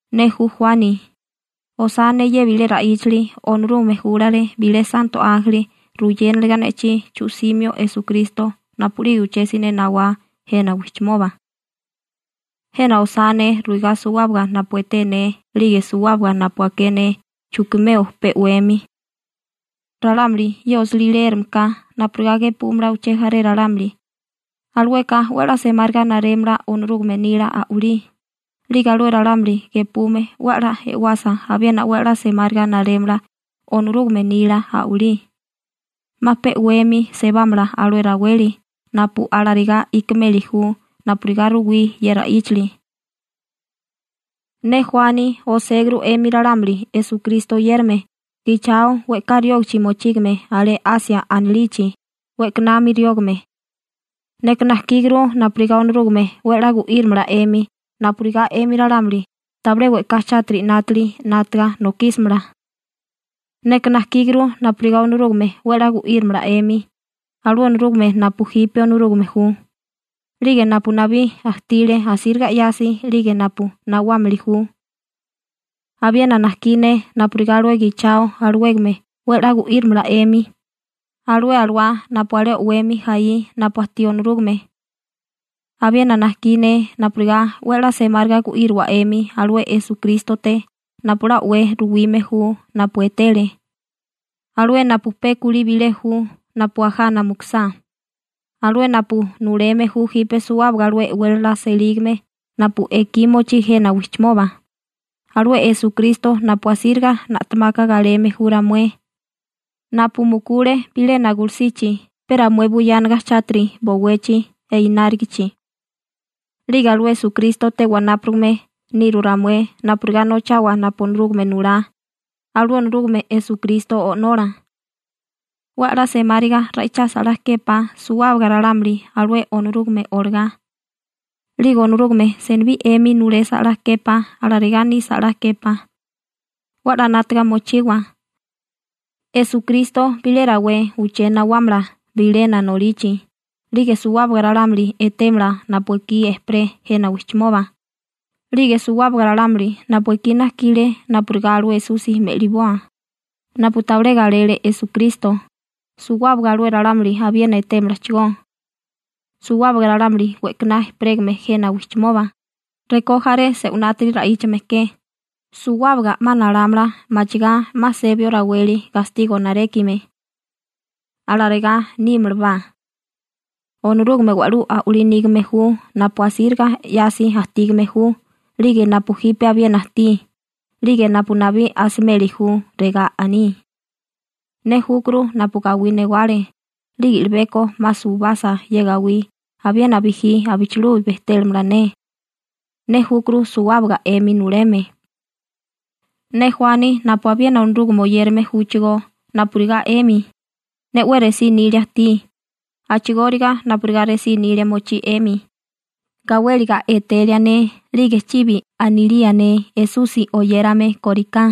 Ne ju Juani. Osá ne ye bilé ra'íchali. Onorúgame júlale bilé santo ánjeli ruyéniliga ne'chí chu'simio Esukristo napu'lige uché siné nawá jena wijchimoba. Jena osá ne ruigá suwábaga napu eté ne 'lige suwábaga napu aké ne chukimeo pe 'wemi. Ralámuli ye osilí leérame ka napurigá gepúmala uché jaré ralámuli, alueka 'we 'la semáriga narémala Onorúgame nila a'walí, 'lige alué ralámuli gepume 'we 'la e'wasa abiena 'we 'la semáriga narémala Onorúgame nila a'walí. 'Ma pe 'wemi sebámala alué raweli napu alarigá ikimeli ju napurigá ruwí ye ra'íchali. Ne Juani oséguru 'emi ralámuli Esukristo oyérame gichao we'ká riógichi mochígame alé Asia anilichi we'kanami riógame. Neka najkíguru napurigá Onorúgame 'we 'la gu'írimala 'emi napurigá 'emi ralámuli tabilé we'ká chátiri 'nátili 'nátaga nokísamala. Neka najkíguru napurigá Onorúgame 'we 'la gu'írimala 'emi, alué Onorúgame napu jipe Onorúgame ju, 'lige napu nabí ajtile asíriga 'yasi, 'lige napu nawámili ju. Abiena najkí ne napurigá alué gichao alawégame 'we 'la gu'írimala 'emi, alué alawá napu alé o'wemi jaí napu ajtí Onorúgame. Abiena najkí ne napurigá 'we 'la semáriga gu'íriwa 'emi alué Esukrístote napu 'la o'wé ruwime ju napu etele, alué napu pe kulí bilé ju napu ajana mukusá, alué napu nuleme ju jipe suwábaga alué e'wélala selígame napu ekí mochí jena wijchimoba, alué Esukristo napu asíriga na'temaka galeme ju ramué, napu mukule bilena gulusichi pe ramué buyánaga chátiri bowechi i'nárigichi. 'Lige alué Esukrístote wanápurigame niru ramué napurigá nochawa napu Onorúgame nulá, alué Onorúgame Esukristo O'nola. 'We 'la semáriga ra'ichasa 'la képá suwábaga ralámuli alué Onorúgame olagá, 'lige Onorúgame senibí 'emi nulesa 'la képá. Alarigá nisa 'la képá. 'We 'la 'nátaga mochiwa. Esukristo bilé rawé uché nawámala bilena nolichi 'lige suwábaga ralámuli etémala napu ekí ejperé jena wijchimoba, 'lige suwábaga ralámuli napu ekí najkile napurigá alué Esusi me'liboa, napu tabilé galele Esukristo, suwábaga alué ralámuli abiena etémalachigó. Suwábaga ralámuli we'kaná ejperégame jena wijchimoba, rekó jaré se'winátiri ra'íchame ke, suwábaga 'ma nalámala machigá 'ma sebio raweli gastigo narékime. Alarigá nímalabá. Onorúgame wa'lú a'walí nígame ju napu asíriga 'yasi ajtígame ju 'lige napu jipe abiena ajtí, 'lige napu nabí asimeli ju, regá aní: ―Ne júkuru napu gawí newale 'lige i'libeko 'ma suwibasa ye gawí abiena bijí abichilubi bejtélamala ne. Ne júkuru suwábaga 'emi nuleme. Ne Juani napu abiena Onorúgame oyérame júchigó napurigá 'emi, ne 'we resí nilia ajtí, a'chigóriga napurigá resí nilia mochí 'emi, gawéliga etelia ne 'lige chibi anilía ne Esusi oyérame kóriká,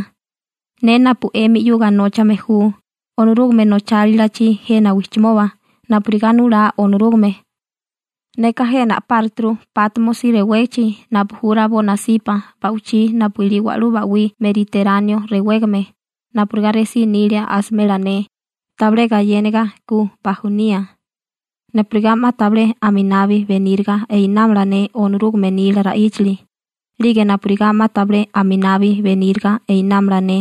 ne napu 'emi 'yuga nóchame ju Onorúgame nochálilachi jena wijchimoba napurigá nulá Onorúgame, neka jena a'páruturu Pátmosi rewégichi napu ju rabó nasipa ba'wichí napu ilí wa'lú ba'wí Meriteráneo rewégame napurigá resí nilia asimela ne tabilé gayéniga ku bajunía, napurigá 'ma tabilé aminabi beníriga einámala ne Onorúgame nila ra'íchali, 'lige napurigá 'ma tabilé aminabi beníriga einámala ne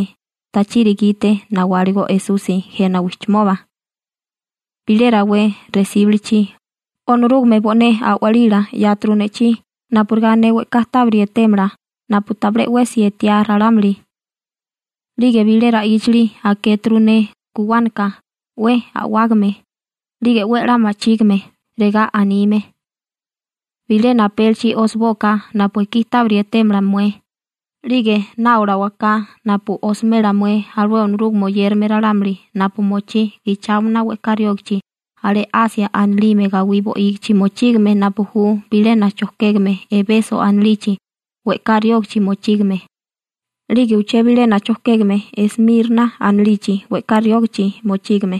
tachiri gite nawáligo Esusi jena wijchimoba. Bilé rawé resíbilichi, Onorúgame bo'né a'walila 'yáturu ne'chí napurigá ne we'ká tábiri etémala napu tabilé 'wesi etiá ralámuli, 'lige bilé ra'íchali akéturu ne guwánaka 'we a'wágame 'lige 'we 'la ma'chígime, regá anime: ―Bilena apélichi osibóaká napu ekí tábiri etémala mué, 'lige náolawaká napu osimela mué alué Onorúgame oyérame ralámuli napu mochí gicháomana we'ká riógachi alé Asia anilime gawí bo'ígichi mochígame napu ju bilena chojkégame Ebeso anilichi we'ká riógichi mochígame, 'lige uché bilena chojkégame Esmirna anilichi we'ká riógichi mochígame,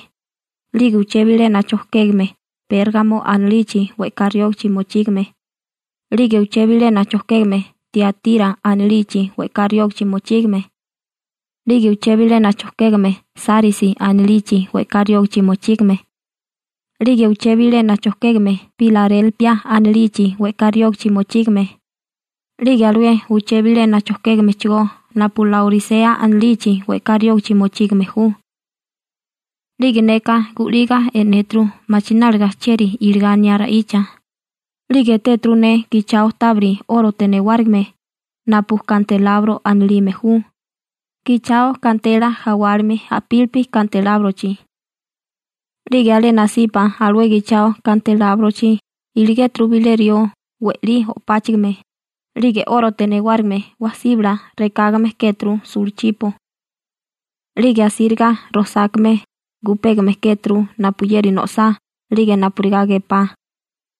'lige uché bilena chojkégame Pérgamo anilichi we'ká riógichi mochígame, 'lige uché bilena chojkégame Tiatira anilichi we'ká riógichi mochígame, 'lige uché bilena chojkégame Sárisi anilichi we'ká riógichi mochígame, 'lige uché bilena chojkégame Pilarélpia anilichi we'ká riógichi mochígame, 'lige alué uché bilena chojkégamechigó napu Laorisea anilichi we'ká riógichi mochígame ju. 'Lige neka gu'liga e'néturu machináliga chieri iligá aniá ra'icha, 'lige etéturu ne gichao tábiri 'órote newárigime napu kantelabro anilime ju, gichao gantela jawálime a'pílipi kantelábrochi. 'Lige alé nasipa alué gichao kantelábrochi iligéturu bilé rió we'lí o'páchigime, 'lige 'órote newárigime síbala rekágame kéturu sulachipo. 'Lige asíriga rojsákame gupégame kéturu napuyeri no'sá 'lige napurigá gepá,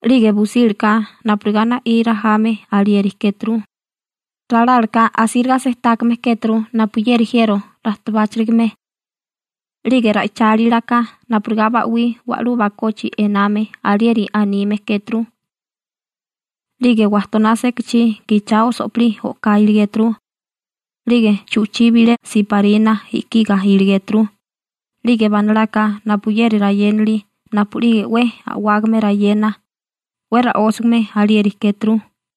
'lige busílaka napurigá na'í rajame alieri kéturu, ralálaká asíriga sejtákame kéturu napuyeri jiero rajtabáchirigame. 'Lige ra'ichálilaka napurigá ba'wí wa'lú bakochi ename alieri anime kéturu. 'Lige wajtoná sekachí gichao so'pilí o'ká iligéturu. 'Lige chu'chí bilé siparina i'kiga iligéturu, 'lige banalaka napuyeri rayénali napu'lige 'we a'wágame rayena, 'we ra'ósagame alieri kéturu.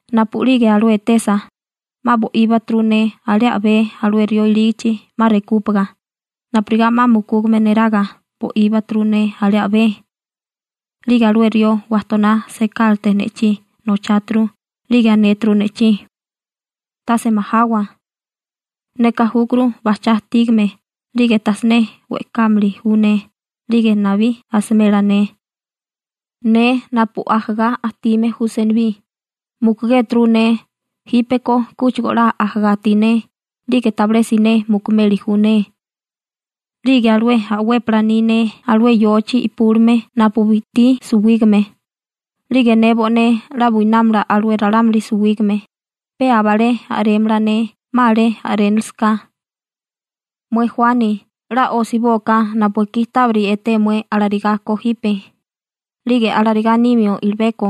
Napu'lige alué etesa 'ma bo'íbaturu ne alé a'bé alué rió ilígichi 'ma rekúpaga, napurigá 'ma mukúgame neraga bo'íbaturu ne alé a'bé. 'Lige alué rió wajtoná sekálate ne'chí nocháturu, 'lige anéturu ne'chí: ―Tase majawa. Neka júkuru bajchá ajtígame 'lige tajsiné we'kámili ju ne 'lige nabí asimela ne. Ne napu ajagá ajtime ju senibí, mukugéturu ne, jípeko kúchigo 'la ajagá ajtí ne 'lige tabilé siné mukumeli ju ne. 'Lige alué a'wépala ni ne alé yochi i'púlime napu bi'tí suwígame, 'lige ne bo'né 'la buinámala alué ralámuli suwígame, pe aba alé a'rémala ne 'ma alé a'rénilisaká. Mué Juani, 'la osibóaká napu ekí tábiri eté mué alarigá ko jipe, 'lige alarigá nimio i'libeko.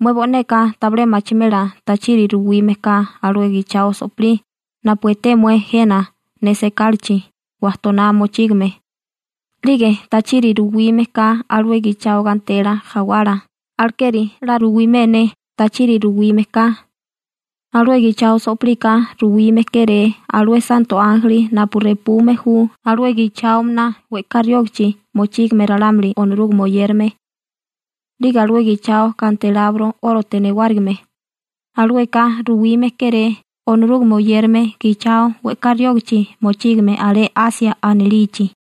Mué bo'neka tabilé machimela tachiri ruwime ka alué gichao so'pilí napu eté mué jena ne sekálachi wajtoná mochígame, 'lige tachiri ruwime ka alué gichao gantela jawala, alekeri 'la ruwimé ne tachiri ruwime ka: Alué gichao so'pilika ruwime kéré alué santo ánjeli napu repume ju alué gicháomana we'ká riógichi mochígame ralámuli Onorúgame oyérame. 'Lige alué gichao kantelabro 'órote newárigime, alueka ruwime kéré Onorúgame oyérame gichao we'ká riógichi mochígame alé Asia anilichi.